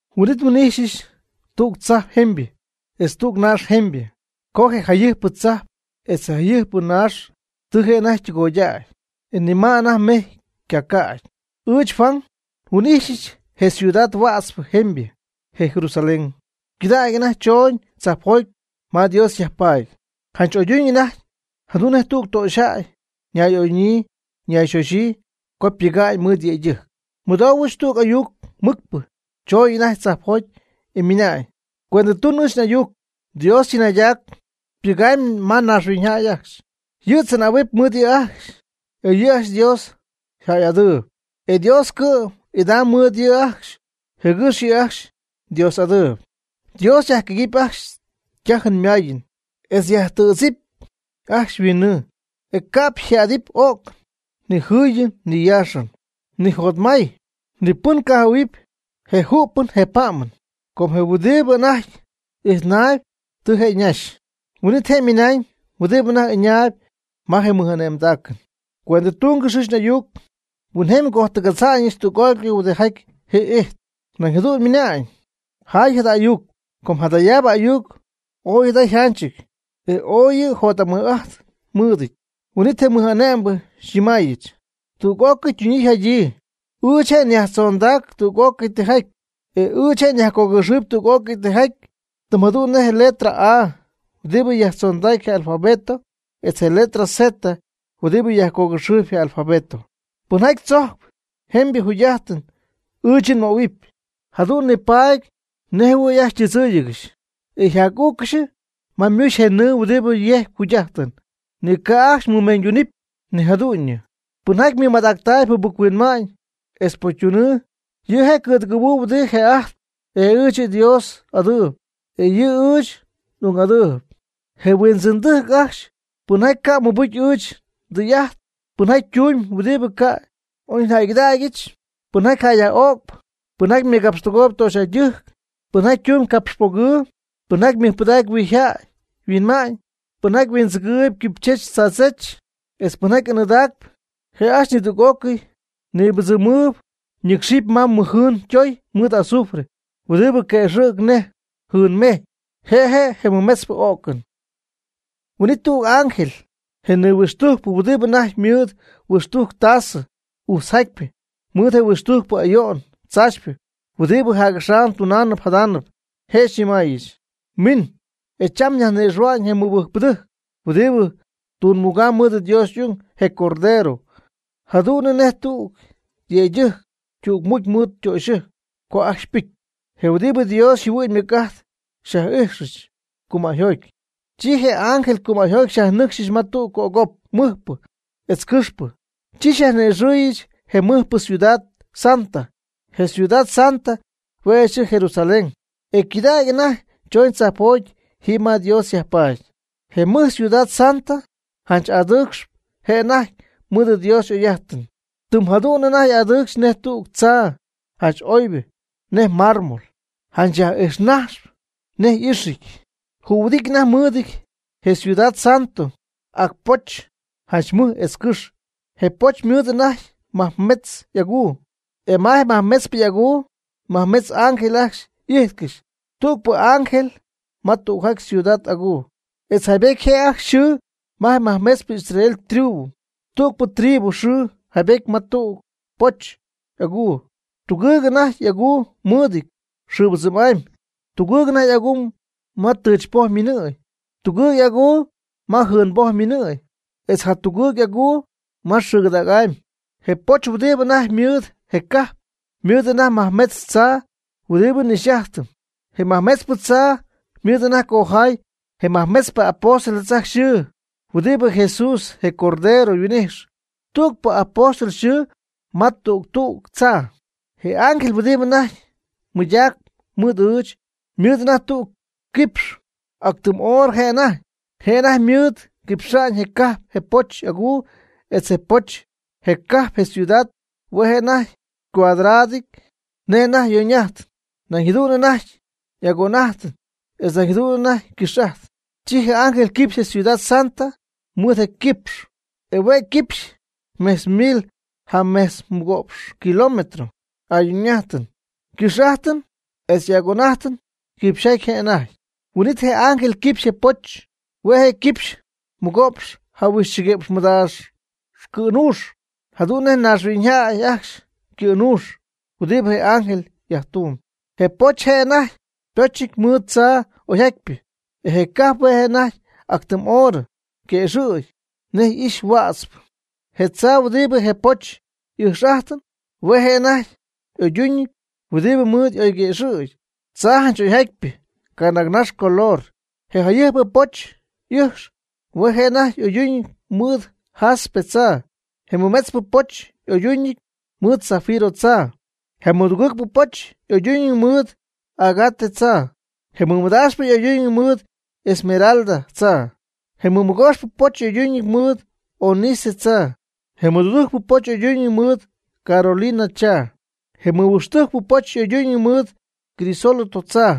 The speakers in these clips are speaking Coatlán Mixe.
Huin'it nhuin'ijxyɨch tüg tzajp jemybɨ etz tüg naax jemybɨ, com je jayɨjpɨ tzajp etz je jayɨjpɨ naax tɨ je' anajty ytɨgoydäy, e ni ma anajty mejy ycacädy. Ɨɨch, Juan, nhuin'ijxyɨch je ciudad huätzpɨ jemybɨ, je Jerusalén, ycɨdägy anajty chooñ tzajpjoty ma Dios yajpaady, janch oyduñ anajty, jadu'n nej tüg töxyjäy ñay'oyduñyii ñayxoxyii co ypɨga'ñ mɨɨd yëydɨjc. Nmɨdoohuɨch tüg ayuc mɨcpɨ chooñ anajty tzajpjoty, e ymɨnañ: ―Cuendɨtun ɨɨch n'ayuc. Dios tzɨnaydac pɨgamb ma naaxhuiñyjäy ajcxy. Yɨ' tzɨnähuɨpy mɨɨd yɨ' ajcxy, e yɨ' ajcxy Dios yjäy'adɨɨyb. E Dios cɨ'm idaamb mɨɨd yɨ' ajcxy jɨgɨx yɨ' ajcxy Dios'adɨɨyb. Dios yajquëgɨɨb ajcxy ytajɨn ymayɨn etz yajtɨ̈dzɨɨb ajcxy yhuinnɨɨ, e ca'p yjadɨɨb o'cɨn ni jɨyɨn ni yaaxɨn, ni jotmay, ni pɨn ycajɨhuɨ̈huɨp je ju'pɨn je pa'mɨn. Com je huɨdibɨ anajty ijtnaayb, tɨ je' ñaxy. Huin'it je' ymɨnañ huɨdibɨ anajty ɨñaayb ma je mɨj'ane'mdacɨn: ―Cuendɨtungɨx ɨɨch n'ayuc. Huinjemy ngojtɨgadza'ñɨch tüg'ócɨy huɨdibɨ jii'ijtp. Nañ jadu'n ymɨnañ: ―Jaay jada ayuc. Com jadayaabɨ ayuc ooy jada yjanchɨty, e ooy yɨ' jot'amɨj'ajt mɨɨdɨty. Huin'it je mɨj'ane'mbɨ xyñɨmaayɨch: ―Tɨ tüg'ócɨy ytunyii yjadyii. Ɨɨch je' nyajtzondacp tüg'ócɨy tijaty, etz ɨɨch nyajcogɨxɨɨyb tüg'ócɨy tijaty, tɨm jadu'n nej je letra A huɨdibɨ yajtzondacp je alfabeto etz je letra Z huɨdibɨ yajcogɨxɨɨyb je alfabeto. Pɨnjaty tzojcp jemybɨ jugy'ajtɨn ɨɨch yɨ' nmöhuɨp. Jadu'n nipaady nej jɨhuɨ̈y ajcxy ytɨdzɨ́ɨyɨgɨxy, e nyaj'ügɨch ma ymuxy je nɨɨ huɨdibɨ yejcp jugy'ajtɨn, ni ca' ajcxy mɨmeeñyduunɨp ni jadu'ñɨ. Pɨnjaty mɨmadactaayb jɨbɨc-huinma'ñ etz pocytunɨɨ, yɨ' je' cɨ̈dɨgɨ̈huɨɨb huɨdibɨ një'ajtpy, e ɨɨch yɨ' xyDios'adɨɨb, e yɨ' ɨɨch n'ung'adɨɨyb. Je huindzɨ̈cytɨjc ajcxy, pɨnjaty ca' ymɨbɨcy ɨɨch ndɨy'ajt, pɨnjaty tumb huɨdibɨ ca' y'oyjäygɨdaacnɨty, pɨnjaty jäy yaj'öcp, pɨnjaty mɨgapxtɨgooyb töxyjäydɨjc, pɨnjaty tumb capxpogɨɨ, pɨnjaty mɨjpɨdacp huijyjäy yhuinma'ñ, pɨnjaty huindzɨgɨɨyb quipychech tzaadzech, etz pɨnjaty anɨɨdacp, je' ajcxy nidüg'ócɨy nibɨdzɨmɨɨb ñɨcxɨpy ma mɨjjɨɨn ytoy mɨɨd azufre, huɨdibɨ quëxɨ̈cp nej jɨɨnmejy. Je' je' je mɨmetzpɨ o'cɨn. Huin'it nidüg ángel je nihuixtujcpɨ huɨdibɨ anajty mɨɨd huixtujc tasɨ ujtzjatypɨ mɨɨd je huixtujcpɨ ayo'n tzaachypɨ huɨdibɨ jac'axam tunaanɨp jadaanɨp, je' xyñɨmaayɨch: ―Min, e cham nyajni'ixɨ̈hua'ñ je mɨbɨjcpɨdɨjc huɨdibɨ tügmugamb mɨɨd Dios y'ung, je Cordero, jadu'n nej tüg yëydɨjc ytügmucy mɨɨd ytöxyɨjc co ajcxy ypɨcy. Je huɨdibɨ Dios yjɨhuɨ'ñ ymɨc'ajt xyaj'ijxɨch cumäyjoty, chi je ángel cümäyjoty xyajnɨcxyɨch ma tüg cop mɨjpɨ etz cɨxpɨ, chi xyaj'ijxyɨch je mɨjpɨ ciudad santa. Je ciudad santa hue' je' yxɨɨ Jerusalén, e ycɨdägy anajty chooñ tzajpjoty jiiby ma Dios yajpaady. Je mɨj ciudad santa janch adɨɨcxp je' anajty mɨɨd Dios y'oy'ajtɨn. Jɨm jadu'n anajty y'adɨɨcxy nej tüg tzaa janch oybɨ nej mármol, janch yaj'ijxnajxp nej ijxɨn. Jühuɨdityɨ anajty mɨɨdɨty je ciudad santo ac poch janch mɨj etz cɨxy. Je poch ymɨɨd anajty majmetz y'aguu. E ma je majmetzpɨ y'aguu majmetz ángel ajcxy y'ijtcɨxy, tügpɨ ángel ma tügjaty ciudad aguu. Etz yjaybetyɨty je' ajcxy yxɨɨ je majmetzpɨ Israel tribu, tügpɨ tribu yxɨɨ yjaybetyɨty ma tüg tüg poch y'aguu. Tugɨɨg anajty y'aguu mɨɨdɨty xɨɨbɨdzɨm'amy, tugɨɨg y'aguu ma tɨchypoj ymiinɨɨy, tugɨɨg y'aguu ma jɨɨnboj ymiinɨɨyɨn, etz jatugɨɨg y'aguu ma xɨɨgɨdägy'amy. Je poch huɨdibɨ anajty ymɨɨd je cajp, ymɨɨd anajty majmetz tzaa huɨdibɨ y'ɨjx'ajtɨp, e majmetzpɨ tzaa ymɨɨd anajty cojaay je nimajmetzpɨ apóstoles ajcxy yxɨɨ huɨdibɨ Jesús, je Cordero, yhuin'ijx, tügpɨ apóstol yxɨɨ ma tüg tüg tzaa. Je ángel huɨdibɨ anajty mɨydacp mɨɨd ɨɨch, ymɨɨd anajty tüg quipx ac tɨm oorɨ je' anajty. Je' anajty mɨɨd quipxa'ñ je cajp, je poch y'aguu, etz je poch. Je cajp, je ciudad, hue' je' anajty cuadradɨ; nej anajty yoñ'ajt, nañ jadu'n anajty y'agon'ajt, etz nañ jadu'n ycɨx'ajt. Chi je ángel quipxy je ciudad santa mɨɨd je' yquipx. E hue' quipxy mejtz mil jamejtz mɨgo'px kilómetros, y'ayoñ'ajtɨn ycɨx'ajtɨn etz y'agon'ajtɨn quipxyjaty je' anajty. Huin'it je ángel quipxy je poch, hue' quipxy mɨgo'px jahuixchɨguïpx mɨdaax cɨ̈nuux, jadu'n nej naaxhuiñyjäy ajcxy ycɨ̈nuux, huɨdi je ángel yajtumyb. Je poch hue' je' anajty ypochɨty mɨɨd tzaa oyjatypɨ, e je cajp hue' je' anajty ac tɨm oorɨ, yguëxɨ̈gy nej ijx huätzpɨ. Je tzaa huɨdibɨ je poch y'ɨjx'ajtɨp hue' je' anajty y'oyduñɨty huɨdi mɨɨd y'oyguëxɨ̈gy, tzaa janch oyjatypɨ canaagnax color. Je jayɨjpɨ poch y'ɨjx hue' anajty y'oyduñɨty mɨɨd jaspe tzaa, je mɨmetzpɨ poch y'oyduñɨty mɨɨd safiro tzaa, je mɨdugɨɨgpɨ poch y'oyduñɨty mɨɨd ágate tzaa, je mɨmadaaxpɨ y'oyduñɨty mɨɨd esmeralda tzaa, je mɨmɨgooxpɨ poch y'oyduñɨty mɨɨd ónice tzaa, je mɨdudujcpɨ poch y'oyduñɨty mɨɨd coralina tzaa, je mɨhuixtujcpɨ poch y'oyduñɨty mɨɨd crisólito tzaa,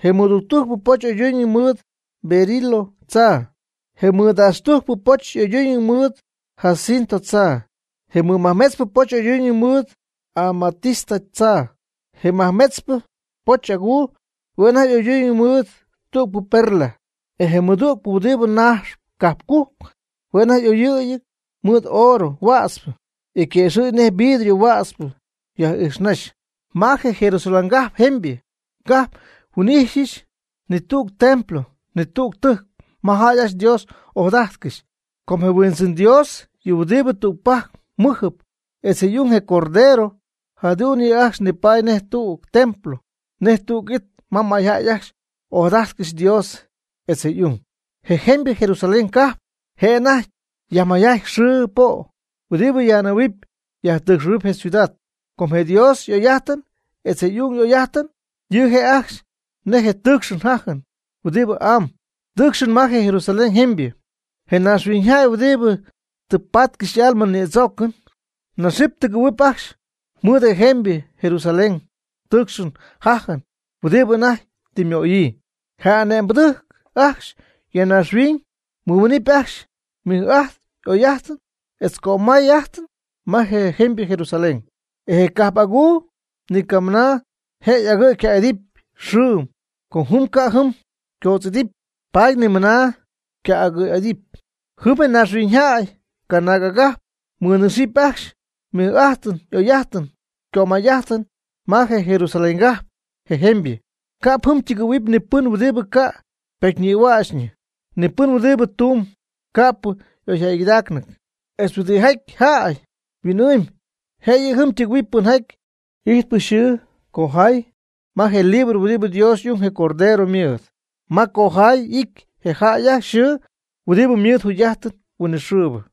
je mɨtuctujcpɨ poch y'oyduñɨty mɨɨd berilo tzaa, je mɨdaxtujcpɨ poch y'oyduñɨty mɨɨd jacinto tzaa, je mɨmajmetzpɨ poch y'oyduñɨty mɨɨd amatista tzaa. Je majmetzpɨ poch'aguu hue' anajty y'oyduñɨty mɨɨd tügpɨ perla. E je mɨjtu' huɨdibɨ najxp cajpcujc hue' y'oyɨɨy mɨɨd oorɨ huätzpɨ, e yquëxɨ̈gy nej vidrio huätzpɨ yaj'ijxnajxp. Ma je Jerusalén cajp jemybɨ ca'p nhuin'ijxyɨch ni tüg templo, ni tüg tɨjc ma jäy ajcxy Dios ojadajtcɨxy. Com je Huindzɨn Dios, yɨ huɨdibɨ tügpajc mɨjɨp, etz je' y'ung, je Cordero, jadu'n yɨ' ajcxy nipaady nej tüg templo nej tüg it ma mayjäy ajcxy y'ojadájtɨgɨxy Dios etz je' y'ung. Je jemybɨ Jerusalén ca'p je' anajty yajmayjaty xɨɨ po' huɨdibɨ yaj'anɨ̈huɨp yajtɨɨcxɨ̈huɨp je ciudad, com je Dios y'oy'ajtɨn etz je' y'ung y'oy'ajtɨn yɨ' je' ajcxy nej je tɨɨcxɨn jajɨn huɨdibɨ amb tɨɨcxp ma je Jerusalén jemybɨ. Je mayñaaxhuiñyjäy huɨdibɨ tɨ patcɨxy y'alma nïdzoocɨn naxɨ́py tɨgɨ̈huɨpy ajcxy mɨɨd je jemybɨ Jerusalén ytɨɨcxɨn yjajɨn huɨdi anajty tɨ ymöyii. Je ane'mbɨdɨjc ajcxy ya naaxhuiñ ymɨmiinɨpy ajcxy mɨj'ajt, oy'ajt, etz cömay'ajt ma je jemybɨ Jerusalén. E je cajp aguu ni camɨna je' agɨ̈y yca'idɨpy xɨɨm, com jɨm ca' jɨm ycoodz'idɨpy, paady ni mɨna yca'agɨ' y'idɨpy. Jɨm je naaxhuiñyjäy, canaag agajp, mɨnɨcxɨp ajcxy ymɨj'ajt y'oy'ajt ycömay'ajt ma je Jerusaléngajp, je jemybɨ. Ca'p jɨm ytɨgɨ̈huɨpy ni pɨn huɨdibɨ ca' ypocyñïhuächñɨ, ni pɨn huɨdibɨ tumb ca'pɨ y'oyjäygɨdaacnɨty, etz huɨdijaty jäy huin'ɨɨmb. Jëyɨ jɨm tɨgɨ̈huɨp pɨnjaty ijtp yxɨɨ cojay ma je libro huɨdibɨ Dios y'ung, je Cordero, ymɨɨd, ma cojay y'ity je jäy ajcxy yxɨɨ huɨdibɨ ymɨɨd jugy'ajtɨn huinɨxɨɨbɨ.